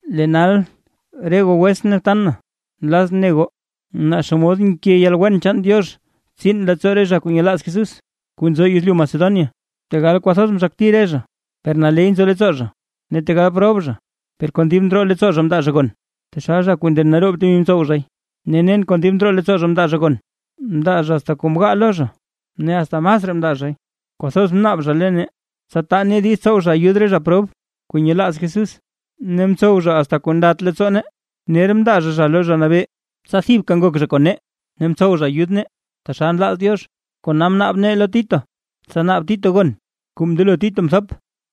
Lee nal re goo wetsʼn ne btan na, nlazʼn ne goo, naa xomod nke yalwen chaan Diox tsiin leettsoo re zha kuu nyelaaz Jesús kuu nzo yezlyu Macedonia. Tegal kwathoz mzhakti re zha, per naley nzo leettsoo zha; ne tegal prob zha, per kon dib ndroo leettsoo zha mndaa zha gon, taxal zha kuu nden naroob temi mtsow zha. Ne nen kon dib ndroo leettsoo zha mndaa zha gon, mndaa zha asta kuu mgaa lo zha, ne asta masraa mndaa zhay. Kwathoz mnaab zha lo nee, tsa taa nee diiz tsow zha ayud re zha prob kuu nyelaaz Jesús. Ne mtsow zha asta kuu ndat leettsoo nee, ner mndaa zha zha lo Zha Nabee, tsa thibka ngok zha kon nee, ne mtsow zha ayud nee; taxal nlaaz Diox. Kona mnaab nee lo Tito, tsa naab Tito gon kuu mndelo Tito mthop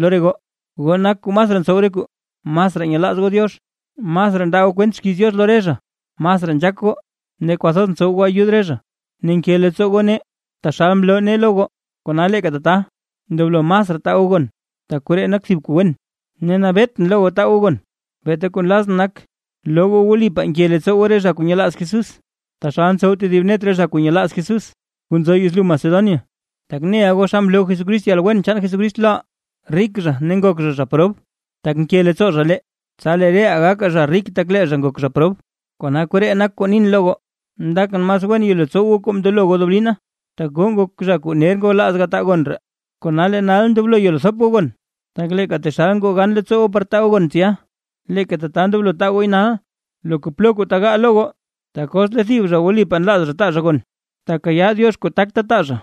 lo re goo. Goo nak kuu masraa ntsow re kuu: masraa nyelaaz goo Diox, masraa ndaa goo kwent xkiiz Diox lo re zha, masraa nzhaak goo ne kwathoz ntsow goo ayud re zha, ne nke leettsoo goo nee taxal mloo nee lo goo; kona leeka tata ndoblo masraa taa goo gon, tak koree nak thib kuu wen. Ne nabeetʼn lo goo taa goo gon, beeta kuu nlazʼn nak, loo goo wlipaa nke leettsoo goo re zha kuu nyelaaz Jesús, taxal ntsow tedib net re zha kuu nyelaaz Jesús kuu nzo yezlyu Macedonia. Tak neʼa goo xa mloo Jesucrist yalwen chaan Jesucrist loʼaa, rik zha ne ngok zha prob tak nke leettsoo zha lee, tsa lee reʼaa gakaa zha rik tak lee zha ngok prob. Kona koree nak kuu nin lo goo. Ndakʼn mas wen yelo tsow goo kuu mndelo goo deblina, tak goo ngok zha kuu ner ngwalaaz gataa gon ree. Kona lee nal ndoblo yelo thop goo gon, tak leeka taxal ngoo gan leettsoo goo par taa gooy tsya, leeka tata ndoblo taa gooy nal, loka plo tegaa lo goo. Tak os lee thib zha wlipaa nlaaz zha taa zha gon, takayaa Diox kuu takta taa zha,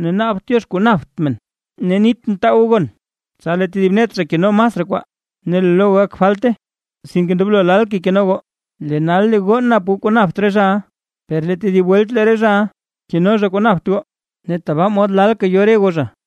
ne naabt Diox kuu napt men. Ne nitʼn taa goo gon, tsa lee thib net zha keno masraa kwaa, ne lee lo goo gak falte, sinke ndoblo lalkay keno goo; lee nal lee re goo nap goo kuu napt re zhaʼa, per lee tedib welt lee re zhaʼa keno zha kuu napt goo, ne tabaa mod lalka yo re goo zha.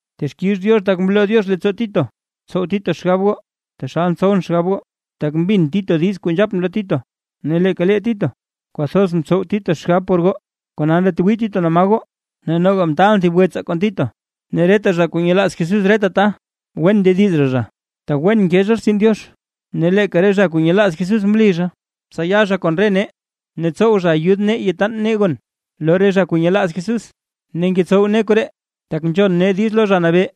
Texkix Diox tak mloo Diox leettsoo Tito tsow Tito xgab goo, taxal ntsowʼn xgab goo. Tak mbin Tito diiz kuu nzhapʼn lo Tito, ne leeka lee Tito kwathoz ntsow Tito xgab por goo, kona ndatwii Tito naa ma goo. Ne noga mtaalʼn thib wetsaa kon Tito, ne reta zha kuu nyelaaz Jesús reta ta, wen ndediz zha zha, tak wen nke zha rtsin Diox. Ne leeka re zha kuu nyelaaz Jesús mli zha, tsa ya zha kon re nee, ne tsow zha ayud nee yataan nee gon lo re zha kuu nyelaaz Jesús, ne ngetsow nee koree, tak nzhon nee diiz lo Zha Nabee,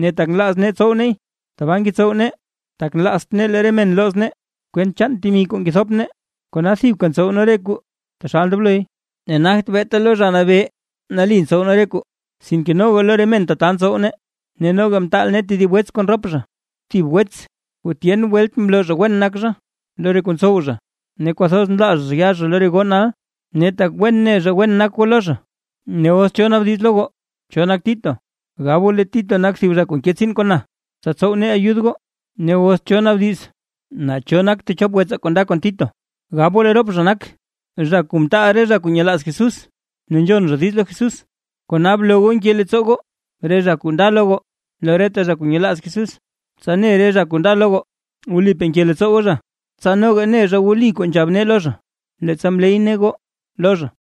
ne tak nlaaz nee tsow neey. Tbaa ngetsow nee tak nlaazt nee lee re men looz nee, kwent chaan temi kuu ngethop nee. Kona thibka ntsow nee re kuu taxal ndobloy, ne nagt beeta lo Zha Nabee nali ntsow nee re kuu, sinke noga lo re men tata ntsow nee. Ne noga mtaal nee tedib wets kon rop zha, thib wets kuu tyen welt mloo zha wen nak zha lo re kuu ntsow zha; ne kwathoz nlaaz zha yaa zha lo re goo nal, tak wen ne zha wen nak goo lo zha. Ne os cho naabdiz lo goo, cho nak Tito, gab goo lee Tito nak thib zha kuu nke tsiin kon na, tsa tsow nee ayud goo. Ne os cho naabdiz naa cho nak techop wetsaa kuu nda kon Tito, gab goo lee rop zha nak zha kuu mtaal re zha kuu nyelaaz Jesús, ne nzhon zha diiz lo Jesús. Kona bloo goo nke leettsoo goo re zha kuu nda lo goo, lo reta zha kuu nyelaaz Jesús, tsa ne re zha kuu nda lo goo, wlipaa nke leettsoo goo zha, tsa noga ne zha wli kuu nzhab nee lo zha, leettsa mley nee goo lo zha.